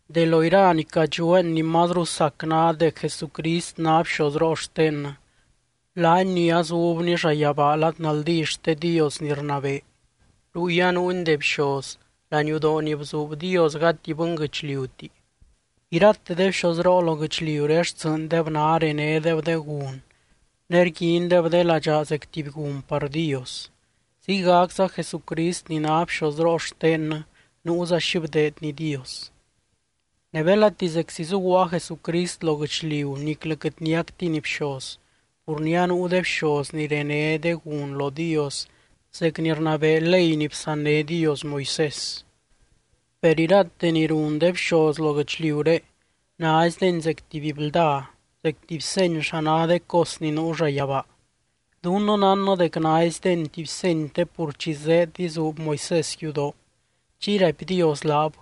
De lo ira ni cadxueen ni mazru sac ná dec Jesucrist ná bxozroo xtennɨ, laany ni azubny llayabaa lad naldí xte Dios ni rnabee. Ruy anuuny de bxoz, laniudoo ni bzuub Dios, gati bɨnguɨchliuti. Irate de bxozroo lo guɨchliuré xtsɨɨndeb ná renédeb de gun ne rguindeb de ladxaa zec tuby gun par Dios. Ziygacza Jesucrist ni ná bxozroo xtennɨ nuuza xi bdeedny Dios. Ne belati zeczi zuguaa Jesucrist lo guɨchliu niclɨ quɨt niactiny bxoz, pur ni anuu de bxoz ni rené de gun lo Dios zec ni rnabee ley ni bsanné Dios Moisés. Per irate ni run de bxoz lo guɨchliuré, naizdeni zec tuby blda, zec tuby seny xa ná de cos ni nuu llayabaa. Dunnɨ nánnɨ dec naizdeni tuby seny te pur chi zéed izuub Moisés yudoo, chiy raipy Dios laab: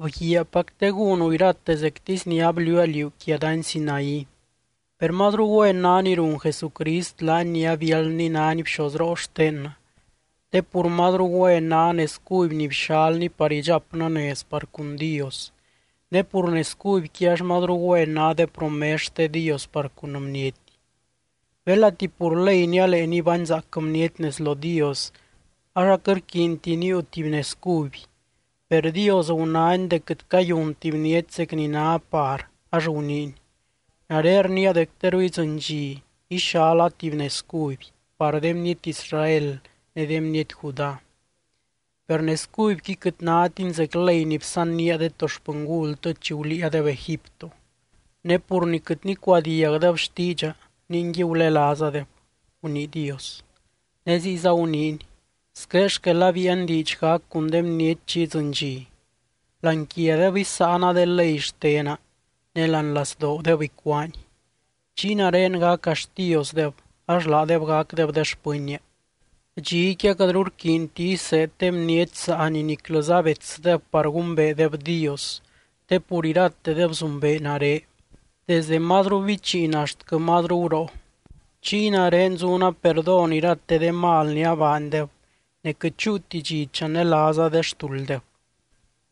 “Bguiaapac te gúnu irate zectisy ni abliuua liú quia dany Sinaí.” Per mazru güen ná ni run Jesucrist laany ni abiáldny nány bxozroo xtennɨ, te pur mazru güen ná nez cuby ni bxalny par idxapnɨ nez par cun Dios. Ne pur nez cubyqui ax mazru güen ná de promes xte Dios par cun bniety. Belati pur ley nialee nibányzaac bniety nez lo Dios, ax aquɨt rquiinti níiu tuby nez cuby. Per Dios gunány dec quɨt cayunti bniety zec ni ná par ax guniiny: Nare rniia dec teru idzɨny dxi ixala tuby nez cuby par de bniety Israel ne de bniety Judá. Per nez cubyqui quɨt nátiny zec ley ni bsannía de to xpɨngultɨ chi guliiadeb Egipto. Ne pur ni quɨt nicuadiagdeb xtiidxa ningui gulelaazadeb, gunii Dios. Ne ziyza guniiny: Squé xquel abíian diidx gac cun de bniety chi idzɨny dxi: Láani quiadeb isáana de ley xtena ne láani lazdoodeb icuáani. Chiy nare gaca Xtiosdeb, ax laadeb gacdeb de xpɨnnia. Dxiqui aquɨtru rquiinti iseed de bniety saani niclɨza betsdeb par gumbeedeb Dios, te pur iratedeb zumbee nare, desdɨ mazru bichiin axtquɨ mazru guroo. Chiy nare zuna perdón irate de mal ni abaandeb, ne quɨt chúuti dxi chanelaaza de xtulddeb.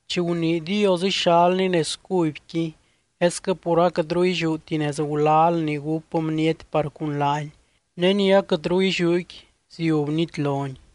Chi gunii Dios ixalny nez cubyqui esquɨ pur aquɨtru illiúti nez gulal ni gúp bniety par cun laany, ne ni aquɨtru illiúqui ziub nitloni.